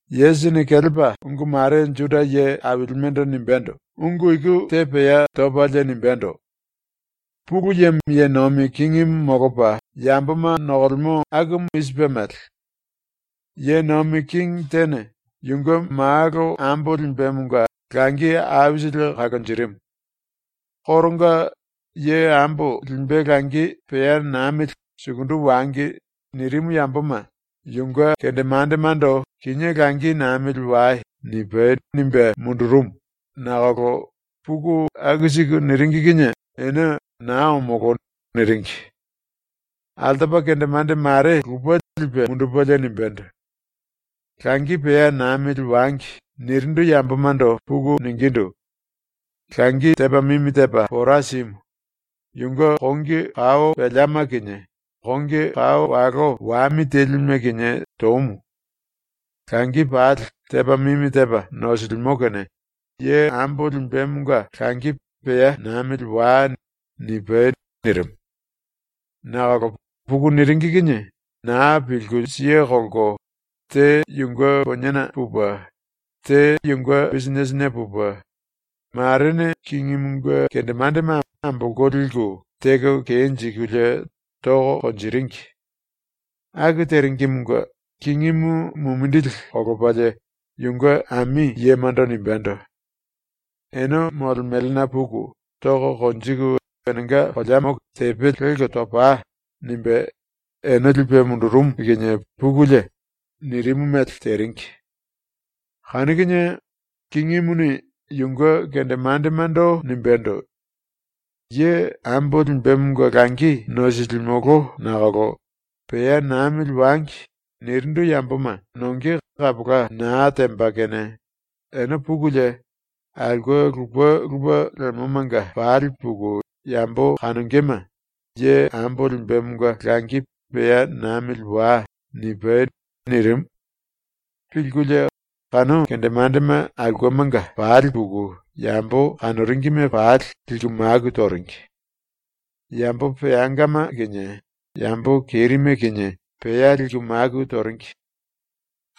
Yesusini kelepa ungu mare ⸤Juda ye ailimendo nimbendo⸥ ungu iku te pea topalie nimbendo: “Pulu Yemo ye nomi kingimu molopa yamboma nokolemo akumu i sipe mele: “Ye nomi kingi tene yunge malo ambo limbemonga langi aisili kalonjirimu. Koronga “Ye ambo limbe langi pea namili sukundu wangi.” nirimu yamboma yunge kendemandemando “ “Kinié langi namili wai.” nipai.” nimbe mundurumu, nakolo puku aku siku niringi kinie ene “Naa omolo.” niringi. Altopa kendemande mare lupe lipe mundupelie nimbendo: “ “Langi pea namili wangi.” nirindu yambomando puku ningindu: “Langi tepa mimi tepa pora simu. Yunge kongi kao peleama kinie kongi kao walo wami telime kinie tomu. Langi pali tepa mimi tepa nosilimo kene ye ambo limbemonga langi pea namili wai.” nipai.” nirimu. Nakolo puku niringi kinie na pilku siye kolko, te yunge poniena pupe, te yunge bisinetena pupe, marene kingimunge kendemandema ambolko liku teko kenjikulie toko konjiringi. ⸤Aku teringimunge⸥ kingimu mumindili kolopalie yunge ami yemando nimbendo: “Ene molemelena puku toko konjiku enenga koleamo tepe lelko topai.” nimbe ene lipe mundurumu kinie pukulie, nirimu mele teringi. Kanu kinie kingimuni yunge kendemandemando nimbendo: “Ye ambo limbemonga langi nosilimolo nakolo “Pea namili wangi.” nirindu yamboma nonge kapola na temba kene ene pukulie aulke lupe lupe lemomanga pali puku yambo kanongema “Ye ambo limbemonga langi pea namili wai.” nipai.” nirimu. Pilkulie kanu kendemandema aulkemanga pali puku yambo kanoringime pali liku maku toringi. Yambo peangama kinie yambo kerime kinie pea liku maku toringi.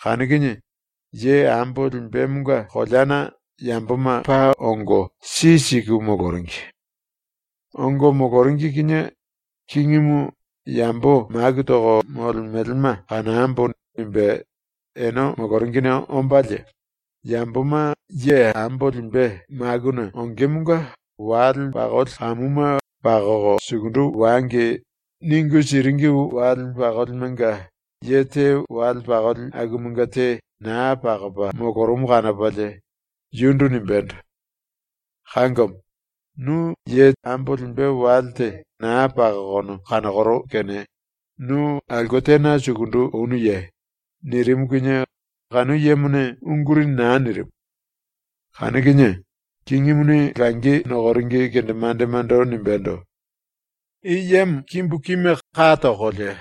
Kanu kinie ye ambo limbemonga koleana yamboma paa ongo si siku moloringi. Ongo moloringi kinie kingimu “Yambo maku toko molemelema kanambo.” nimbe ene moloringine ombalie, yamboma ye ambo limbe ⸤makuna ongemonga wale pakoli kamuma ‘pakoko sukundu wangi.’ ningu siringi⸥ wale pakolimenga ye te wale pakoli akumanga te na pakopa molorumu kanopalie yundu nimbendo: “Kangomo, nu ye ambo limbe wale te na pakokono kanokoro kene nu aulke tena sukundu onuye?” nirimu kinie kanu yemone unguri na nirimu. Kanu kinie kingimuni langi nokoringi kendemandemando nimbendo: “I yemo kimbu kime ka tokolie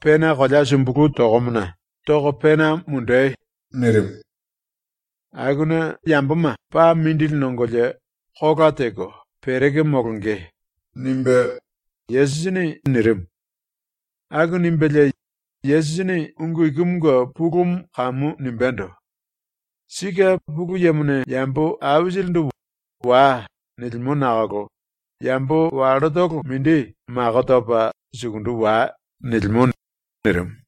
pena kolea sumbulu tokomona toko pena mundei!” nirimu. Akuna yamboma paa mindili nongolie kola teko pereko molonge.” ⸤nimbe Yesusini nirimu.⸥ ⸤Aku nimbelie Yesusini ungu ikumunge pulumu kamu nimbendo:⸥ “Sike ⸤Pulu Yemone⸥ yambo aisilindu “Wai.” nilimo nakolo yambo wallotolo mindi mako topa “Sukundu wai.” nilimo.” nirimu.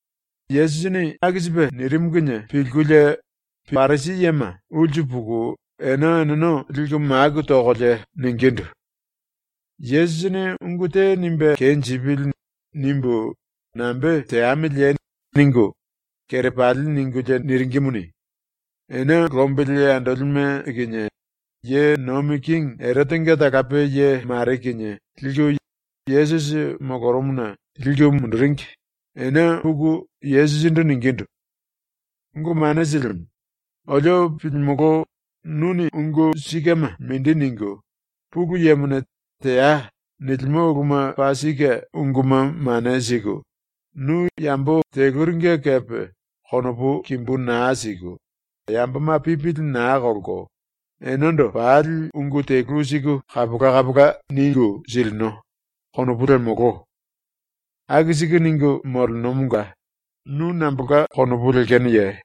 ⸤Yesusini aku sipe nirimu⸥ kinie ⸤pilkulie⸥ Parisi yema ulsu puku ene eneno liku maku tokolie ningindu: “‘Yesusini ungu te nimbe kenjipili.’ nimbu nambe teamiliye?” ningu kerepali ningulie niringimuni, ene lombili andolime kinie ye nomi kingi Erotenga talape ye mare kinie liku Yesusi molorumuna liku munduringi, ene puku Yesusindu ningindu: “Ungu Mane Silimu, olio pilimolo, ‘nuni ungu sikema mindi ningu, Pulu Yemone “Teai.” nilimo uluma paa sike unguma mane siku, nu yambo teluringe kepe konopu kimbu na siku, yamboma pipili na kolko enendo pali ungu telu siku kapola kapola ningu silino.’ konopu lemolo. Aku siku ningu molenomonga nu nambolka konopu lekenoye?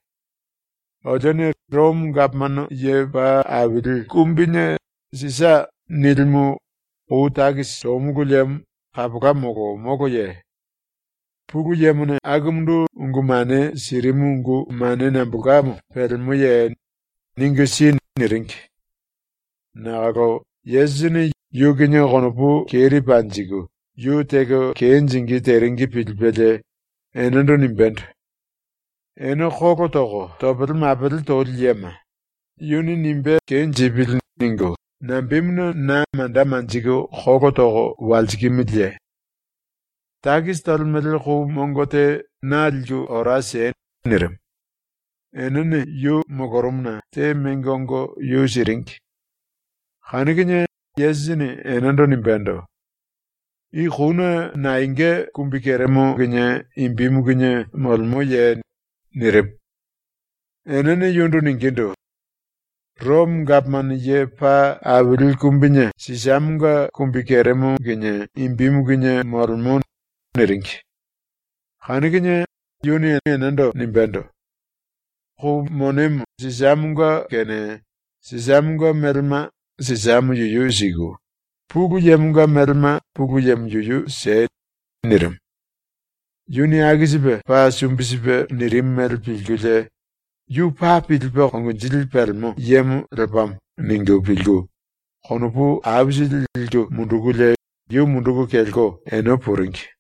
Olione Romo Gapomano Ye Paa Aili Kumbine ‘Sisa’ nilimu kou takisi tomulu liemo kapola molo moloye? Pulu Yemone akumundu ungu mane sirimu ungu mane nambolkamo pelemoye? Ningu si.” niringi. Nakolo Yesusini yu kinie konopu keri panjiku yu teko kenjingí teringi pilipelie enendo nimbendo: “Ene kolo toko topele mapele toli yema, ‘Yuni nimbe kenjipili.’ ningu nambemuna na manda manjiku kolo toko walsikimiliye? Takisi tolemele kou mongo te na liku ora siei.” nirimu. Enene yu molorumuna te mengo ongo yu siringi. Kanu kinie Yesusini enendo nimbendo: “I kouna naenga kumbikeremo kinie imbimu kinie molemoye?” nirimu. Enene yundu ningindu: “Romo Gapomano Ye Paa Aili Kumbine Sisamonga kumbikeremo kinie imbimu kinie molemo.” niringi. Kanu kinie yuni enendo nimbendo: “⸤Kou monemo Sisamonga⸥ kene Sisamonga melema Sisamo yuyu siku, Pulu Yemonga melema Pulu Yemo yuyu siei.” nirimu. Yuni aku sipe ⸤paa sumbi sipe⸥ nirimu mele pilkulie ⸤‘Yu paa pilipe konginjili pelemo yemo lepamo.’ ningu pilku⸥ konopu aisili liku mundukulie yu munduku kelko ene puringi.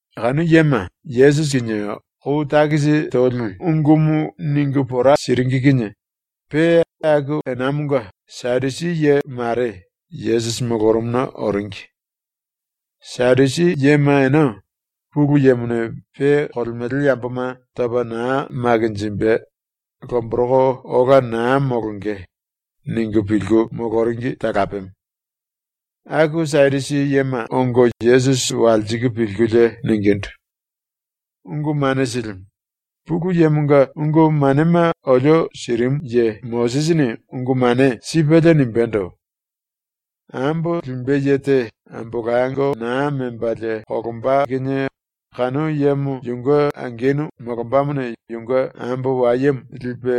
⸤Kanu yema Yesusi kinie kou takisi toli ungumu ningu pora siringi kinie⸥ pe aku enamonga Sadusi ye mare Yesusi molorumuna oringi. Sadusi yema ene ‘Pulu Yemone pe kolemele yamboma topa na makinjimbe, lomboroko ola na molonge.’ ningu pilku moloringi talapemo. Aku Sadusi yema ongo Yesusi walsiku pilkulie ningindu: “Ungu Mane Silimu, ⸤Pulu Yemonga ungu manema olio sirimu ye⸥ Mosisini ungu mane sipelie nimbendo: “Ambo limbe ye te ambolango na membalie kolomba kinie kanu yemo yunge angenu molombamone yunge ambo wayemo lipe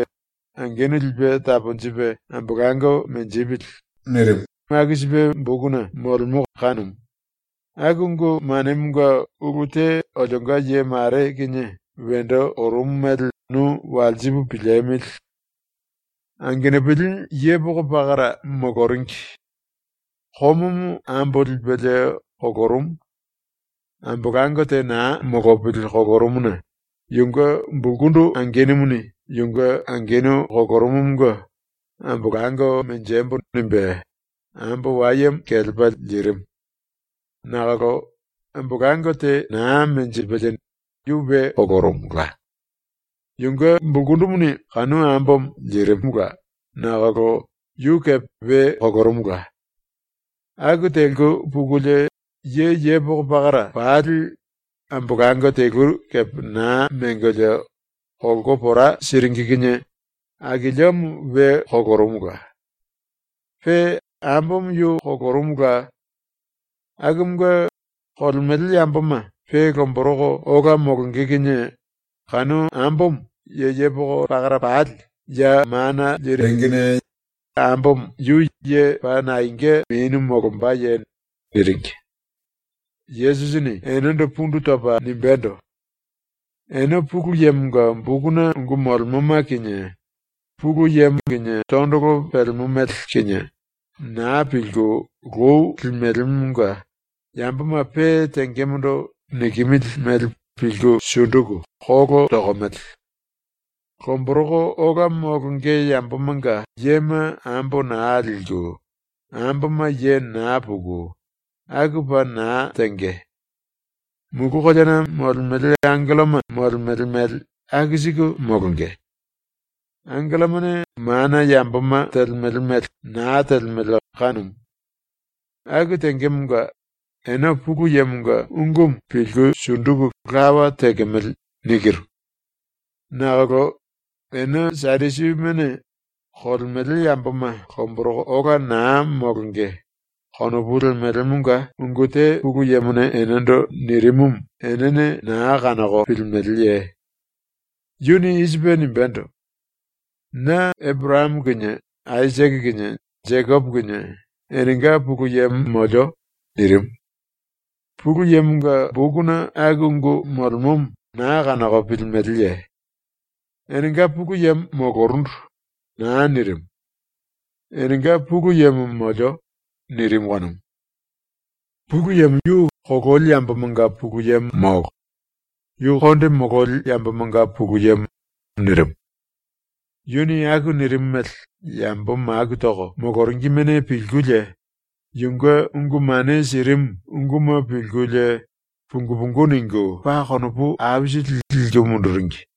angenu lipe taponjipe ambolango menjipili.” nirimu aku sipe bokuna molemo kanumu. ⸤Aku ungu manemonga ulu te olionga ye mare kinie wendo orumu mele nu walsipu piliemili.⸥ “Angenupili yepoko pakara moloringi. Komomo ambo lipelie kolorumu. Ambolango te na molopili kolorumuna yunge bulkundu angenumuni ⸤yunge angenu kolorumumunge⸥ ambolango ‘Menjembo.’ nimbe ambo wayemo kelepa lirimu. Nakolo ambolango te na menjipelie yu we kolorumula. Yunge bulkundumuni kanu ambomo lirimula nakolo yu kepe we kolorumula. Aku teliku pukulie ye yepoko pakara pali ambolango telu kepe na mengolie kolko pora siringi kinie akiliomo we kolorumula. Pe ambomo yu kolorumula. Akumunge, kolemele yamboma pe lomboroko ola molonge kinie kanu ambomo ye yepoko pakara pali ya mana liringine ambomo yu ye paa naenga menu molombaye?” niringi. Yesusini enendo pundu topa nimbendo: “Ene Pulu Yemonga bokuna ungu molemoma kinie, Pulu Yemo kinie tondolo pelemo mele kinie, na pilku lou lemelemonga ⸤yamboma pe tengemondo nikimili mele pilku sunduku kolo tokomele⸥. Lomboroko ola molonge yambomanga yema ambo na liku, amboma ye na puku, aku paa na tenge. Mulu koleana molemele angelloma molemele mele aku siku molonge. ⸤Angellomane mana yamboma telemele mele na telemele kanumu.⸥ Aku tengemonga ⸤‘Ene Pulu Yemonga ungumu pilku sunduku lawa telemele.’ nikiru.⸥ “Nakolo ⸤ene Sadusimene⸥ ‘Kolemele yamboma lomboroko ola na molonge.’ konopu lemelemonga ungu te Pulu Yemone enendo nirimumu enene na kanoko pilimeleye? Yuni i sipe nimbendo: “Na Eporayamo kinie Aisake kinie Jekopo kinie enenga Pulu Yemo molio.” nirimu. Pulu Yemonga bokuna aku ungu molemomo na kanoko pilimeleye? ⸤‘Enenga Pulu Yemo molorundu.’ na nirimu. ‘Enenga Pulu Yemo molio.’ nirimu kanumu.⸥ Pulu Yemo yu kololi yambomanga Pulu Yemo molo; yu konde mololi yambomanga Pulu Yemo.” nirimu. Yuni aku nirimu mele yambo maku toko moloringimene pilkulie yunge ungu mane sirimu unguma pilkulie pungu pungu ningu paa konopu aisili liku munduringi.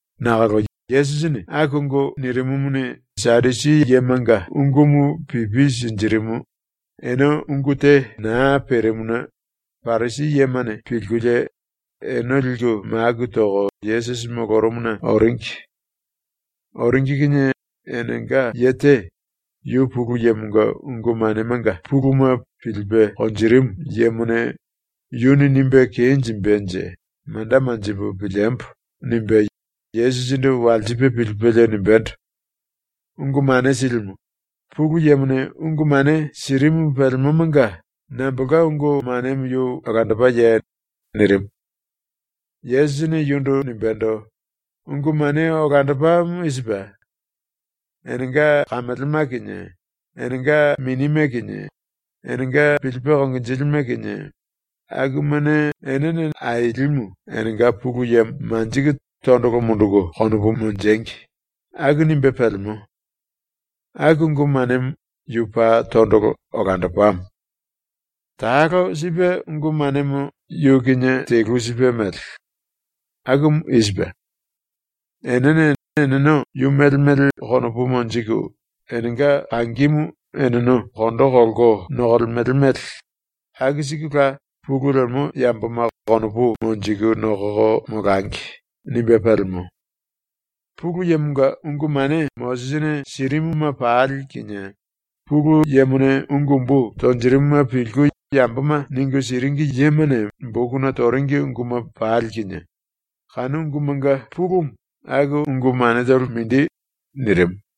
Nakolo Yesusini aku ungu nirimumuni Sadusi yemanga ungumu pipi sinjirimu, ene ungu te na perimuna Parisi yemane pilkulie ene liku maku toko ⸤Yesusi molorumuna⸥ oringi. ⸤Oringi kinie⸥ enenga ye te, yu Pulu Yemonga ungu manemanga puluma pilipe konjirimu yemone ‘Yuni nimbe kenjimbenje manda manjipu piliembo.’ nimbe Yesusindu walsipe pilipelie nimbendo: “Ungu Mane Silimu, Pulu Yemone ungu mane sirimu pelemomanga nambolka ungu manemo yu olandopaye?” nirimu. Yesusini yundu nimbendo: “Ungu mane olandopamo i sipe: ‘Enene enenga kamelema kinie, enenga minime kinie, enenga pilipe konginjilime kinie, akumane Ailimu enenga Pulu Yemo manjiku tondolo munduku konopu monjengi.’ aku nimbe pelemo. Aku ungu manemo yu paa tondolo, olandopamo. Talo sipe ungu manemo yu kinie telu sipe mele. Akumu i sipe: ‘Enene eneno yu mele mele konopu monjiku enenga kangimu eneno kondo kolko nokolemele mele aku sikula pulu lemo yamboma konopu monjiku nokoko molangi.’ nimbe pelemo. Pulu Yemonga ungu mane Mosisini sirimuma pali kinie, Pulu Yemone ungu umbu tonjirimuma pilku yamboma ningu siringi yemane bokuna toringi unguma pali kinie, kanu ungumanga pulumu aku ungu manetolo mindi.” nirimu.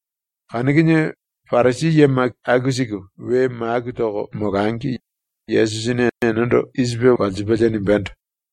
Kanu kinie Parisi yema aku siku we maku toko molangi Yesusini enendo i sipe walsipelie nimbendo: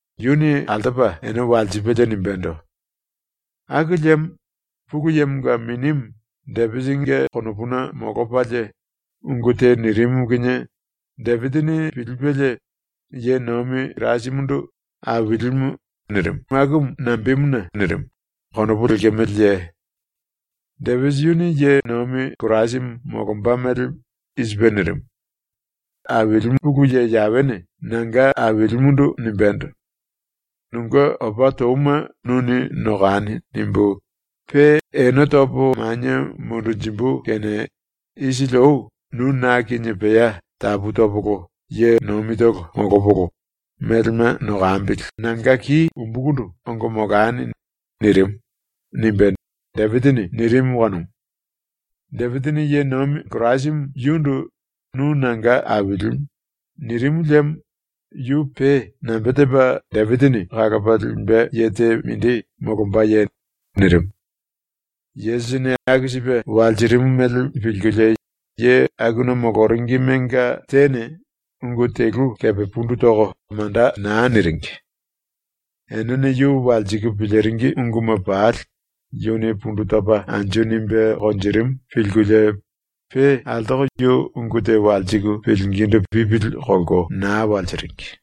Yuni altopa ene walsipelie nimbendo: “Aku liemo ⸤Pulu Yemonga⸥ Minimu Depisinge konopuna molopalie ungu te nirimu kinie Depisini pilipelie ye nomi Kirasimundu “Ailimu” nirimu akumu nambemuna nirimu konopu lekemeleye? Depisi yuni ⸤ye Kirasimu molomba mele⸥ i sipe nirimu: “Aili ⸤Pulu Ye Yawene⸥ nanga Ailimundu nimbendo: “‘Nunge opa touma nuni nokani.’ nimbu, pe ene topo manie mundunjimbu kene isili ou nu ⸤na kinie pea tapu topolo ye nomitolo molopolo melema nokambili⸥ nanga ki umbukundu ongo molani.” nirimu.” nimbe Depisini nirimu kanumu. Depisini ⸤ye nomi Kirasimu⸥ yundu “Nu nanga Ailimu.” nirimu liemo yu pe nambe tepa Depisini kalopa limbe ye te ⸤mindi⸥ molombaye?” nirimu. ⸤Yesusini aku sipe walsirimu mele pilkulie⸥ ye akuna moloringimenga tene ungu telu kepe pundu toko manda na niringi. ⸤Enene yu walsiku piliringi unguma pali yuni pundu topa anju nimbe konjirimu pilkulie⸥ pe altoko yu ungu te walsiku pilingindu pipili kolko na walsiringi.